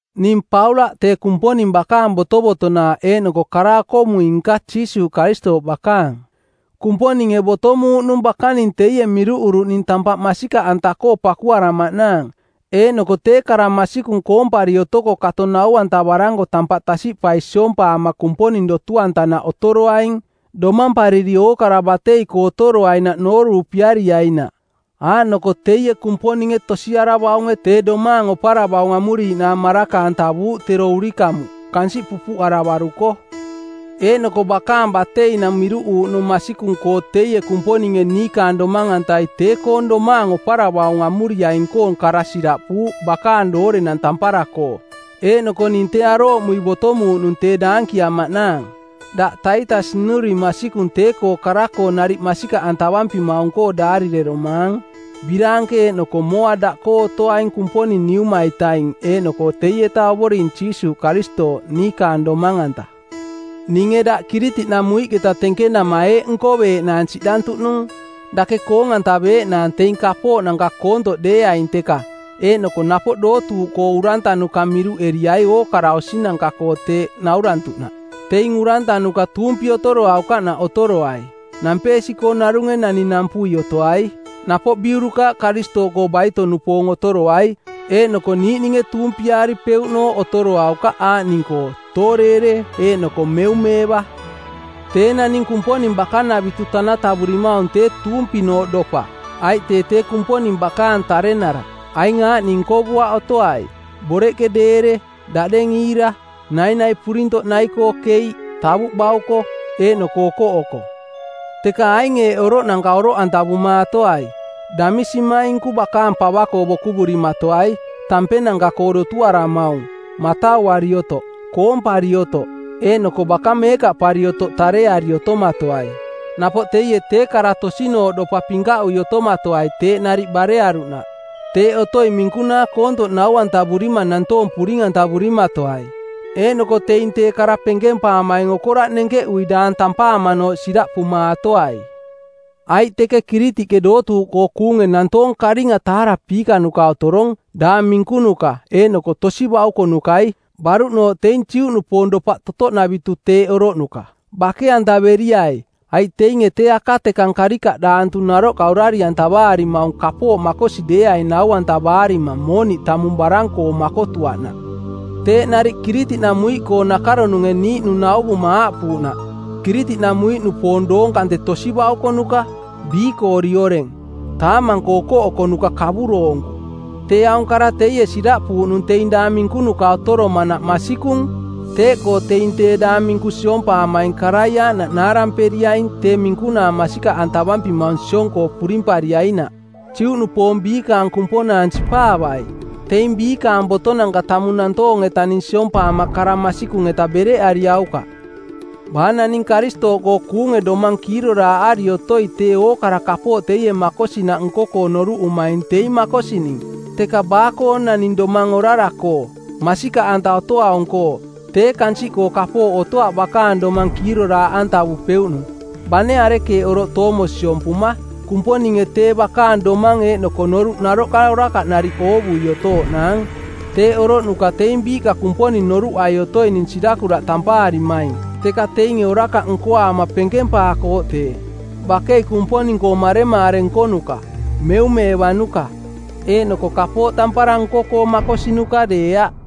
Ning Paulaꞌ tee Kumponing bakaang botovotonaaꞌ eeꞌnoko kara-okomui-nka Jiisuuꞌ Karistooꞌ bakaang. Kumponinge botomuuꞌnung bakaning teie miruꞌuruꞌning tampaꞌ masikaꞌanta-koo pakuaramaꞌnaang eeꞌnoko tee kara masikung koompari otoko kato nau-antavaranko tampaꞌ tasiꞌpai siompaama Kumponing dotu-antanaꞌ otoroaing, domampariri ookara batei-koo otoroainaꞌ nooruupiariainaꞌ; Aaꞌnoko teie Kumponinge tosiaravaunge tee domaang oparavaung amuriiꞌnaang maraka-antavuuꞌ tero urikamuꞌ, kansiꞌ pupuꞌaravaruko. Eeꞌnoko bakaang bateinang miruꞌuuꞌnung masikung-koo teie Kumponinge niikaang Domang-antai tee-koong domaang oparavaung amuriaing-koong kara siraꞌpuuꞌ bakaang doorenang tampara-koo, eeꞌnoko ning tee arooꞌmui botomuuꞌnung tee daankiamaꞌnaang. Daꞌ Taitas nnuring masikung tee-koo kara-koo nariꞌ masikaꞌantavampimaung-koo daarireromaang. Biraanke eeꞌnoko mooa daꞌkoo otoaing Kumponing Niuma-itaing eeꞌnoko teieta Ovoring Jiisuuꞌ Karistooꞌ, niikaang Domang-anta. Ninge daꞌ Kiritiꞌnamuiꞌketa tenkenama eeꞌ nkoveeꞌnaang siꞌdantuꞌnung: Dake koong-antaveeꞌnaang teing kapooꞌnanka koontoꞌ deeaing teka, eeꞌnoko napoꞌ dootuuꞌkoo urantanuka miruꞌeriai ookara osinanka-koo teeꞌ naurantuꞌnaꞌ. Teing urantanuka tuumpi otoroaukaꞌnaꞌ otoroai. Nampeesi-koo narunge nani nampui otoai. Napoꞌ biurukaaꞌ Karistooꞌkoo baito-nupoong otoroai, eeꞌnoko niiꞌninge tuumpiaaripeuꞌnooꞌ otoroaukaꞌ aaꞌning-koo: tooreere eeꞌnoko meumeeva. Tee naning Kumponing bakanavitu tanatavurimaung tee tuumpinooꞌ dopa, aiꞌ tee tee Kumponing bakaang tarenara. Aing aaꞌning nkovuaꞌ otoai: boreꞌke deere, daꞌdeng iira, nainai purintoꞌ nai-koo keiꞌ, tavuꞌ bauko, eeꞌnoko okoꞌoko. Teka aing eeꞌ oroꞌnanka oroꞌantavumaatoai: Damisimainku bakaang pava-koo bokuvurimatoai, tampenanka-koo dotuaramaung, matauari otoꞌ, koompari otoꞌ, eeꞌnoko baka meekaꞌpari otoꞌ tareari otomatoai. Napoꞌ teie tee kara tosinooꞌdopa pinkaꞌui otomatoai teeꞌ nariꞌ barearuꞌnaꞌ. Teeꞌ otoi minkunaa koontoꞌ nau-antavurima nantoong puring-antavurimatoai, eeꞌnoko teing tee kara penkempaamaing okoraꞌ nenkeꞌui daang tampaamanooꞌ siraꞌpumaatoai. Aiꞌ teke Kiritiꞌke dootuuꞌkoo kuunge nantoong karinga taarapiikanuka otorong, daang minkunuka eeꞌnoko tosi baukonukai, baruꞌnooꞌ teing Juꞌnupoong dopaꞌ totoꞌnavitu teeꞌ oroꞌnuka. Bake-antaveriai, aiꞌ teinge tee akatekang karikaꞌdaantu naroꞌka orari-antavaarimaung kapooꞌ makosi deeaing nau-antavaarima mooniꞌ tamung barang-koo makotuaꞌnaꞌ. Teeꞌ nariꞌ Kiritiꞌnamuiꞌkoong nakaronunge˜ niiꞌnung nauvuma aaꞌpuuꞌnaꞌ, “Kiritiꞌnamuiꞌnupoong doong kante tosi baukonuka, biikoori oreng, taamang-koo okoꞌokonuka kavuroonku.” Tee aung kara teie siraꞌpuuꞌnung teing daang minkunuka otoromanaꞌ masikung. Teeꞌkoo teing tee daang minku siompaamaing karai aaꞌnaꞌ naaramperiaing tee minkunaa masikaꞌantavampimaung siong-koo purimpariainaꞌ. Juꞌnupoong biikaang kumponaang sipaavai! Teing biikaang botonanka tamung nantoong-etaning siompaama kara masikung-eta bereꞌariaukaꞌ. Baa naning Karistooꞌkoo kuunge domang kiiroraaꞌari otoi tee ookara kapooꞌ teie makosinaꞌ nko-koo noruꞌumaing teing makosining. Teka baa-koo naning domang orara-koo, masikaꞌanta otoaung-koo, tee kansiꞌkoo kapooꞌ otoaꞌ bakaang domang kiiroraaꞌantavupeuꞌnung, bane arekeeꞌ oroꞌ toomo siompuma. Kumponinge tee bakaang domang eeꞌnoko noruꞌ naroꞌka orakaꞌ nariꞌ oovui otooꞌnaang. Teeꞌ oroꞌnuka teing biiꞌka Kumponing noruꞌai otoining sirakuraꞌ tampaarimaing, teka teinge orakaꞌ nkoaama penkempaakooꞌ tee. Bakei Kumponing-koo maremaare nkonuka, meumeevanuka, eeꞌnoko kapooꞌ tampara nko-koo makosinuka deeaꞌ.